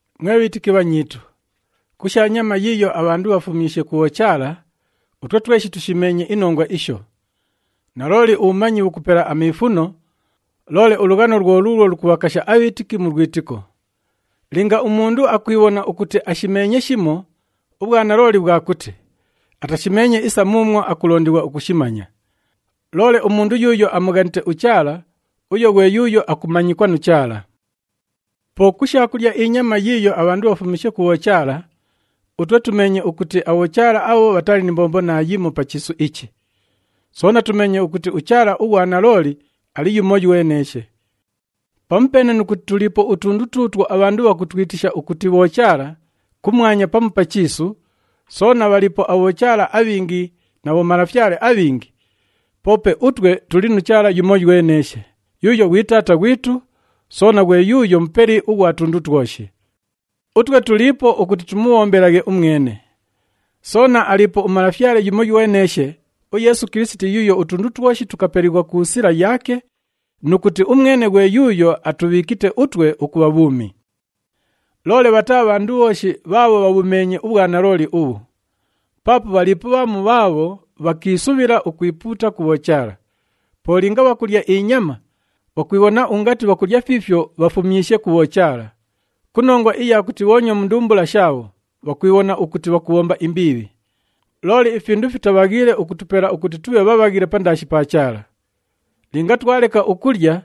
Mwe bhiitiki bhanyiitu, ku sha nyama yiiyo abhandu bhafumyishe ku bhochaala, utwe tweshi tushimeenye inongwa isho. Nalooli, ubhumanyi bhukupela amiifuno, loole ulughano lwo luulwo lukubhakasha abhiitiki mu lwitiko. Linga umundu akwibhona ukuti ashimeenye shimo, ubhwanalooli bhwa kuti, atashimeenye isa muumwo akulondighwa ukushimanya. Loole umundu yuuyo amughanite uChaala, uyo ghwe yuuyo akumanyikwa nu Chaala. Po ku sha kulya inyama yiiyo abhandu bhafumyishe ku bhochaala, utwe tumeenye ukuti abhochaala abho bhatali ni mbombo naayimo pa chiisu ichi. Soona tumeenye ukuti uChaala ughwa nalooli ali yumoyweneeshe. Pamupeene nu kuti tuliipo utundu tuutwo abhandu bhakutwitisha ukuti bhochaala kumwanya pamu pa chiisu, soona bhaliipo abhochaala abhingi na bhomalafyale abhingi, poope utwe tuli nu Chaala yumoyweneeshe, yuuyo ghwi Taata ghwitu, soona ghwe yuuyo Mupeli ughwa tundu twoshi. Utwe tuliipo ukuti tumubhombelaghe umwene. Soona aliipo uMalafyale yumoyweneeshe, uYeesu Kilisiti yuuyo utundu twoshi tukapelighwa ku sila yaake nu kuti umwene ghwe yuuyo atubhiikite utwe ukubha bhuumi. Loole bhataa bhandu bhooshi bhaabho bhabhumeenye ubhwanalooli ubhu. Paapo bhaliipo bhamu bhaabho bhakiisubhila ukwipuuta ku bhochaala. Po linga bhakulya inyama, bhakwibhona ungati bhakulya fiifyo bhafumyishe ku bhochaala. Ku nongwa iya kuti bhoonywa mu ndumbula shaabho, bhakwibhona ukuti bhakubhomba imbiibhi. Loole ifindu fitabhaghiile ukutupela ukuti tubhe bhabhaghile pandaashi pa Chaala. Linga twaleka ukulya,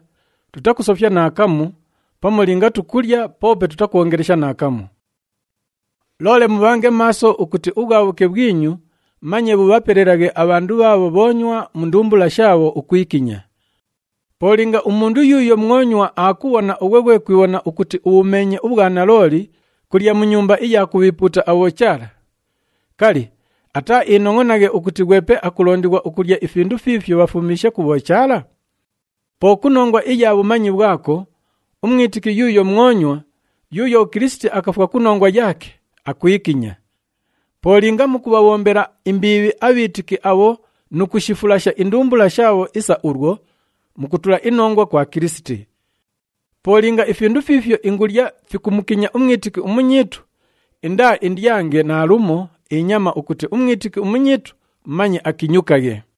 tutakusofya naakamu pamu linga tukulya poope tutakwongelesha naakamu. Loole mubhange maaso ukuti ubhwabhuke bhwinyu manye bhubhapelelaghe abhandu bhaabho bhoonywa mu ndumbula shaabho ukwikinya. Po linga umundu yuuyo mwonywa aakubhona ughwe ghwe kwibhona ukuti ubhumeenye ubhwanalooli kulya mu nyumba iya kubhiipuuta abhochaala, kali, ataaiinongʼonaghe ukuti ghwepe akulondighwa ukulya ifindu fiifyo bhafumyishe ku bhochaala? Po ku nongwa iya bhumanyi bhwako, umwitiki yuuyo mwonywa, yuuyo uKilisiti akafwa ku nongwa yaake, akwikinya. Po linga mukubhabhombela imbiibhi abhiitiki abho nu kushifulasha indumbula shaabho isa ulwo, mukutula inongwa kwa Kilisiti. Po linga ifindu fiifyo ingulya fikumukinya umwitiki umunyiitu, indaaindyange naalumo inyama ukuti umwitiki umunyiitu manye akinyukaghe.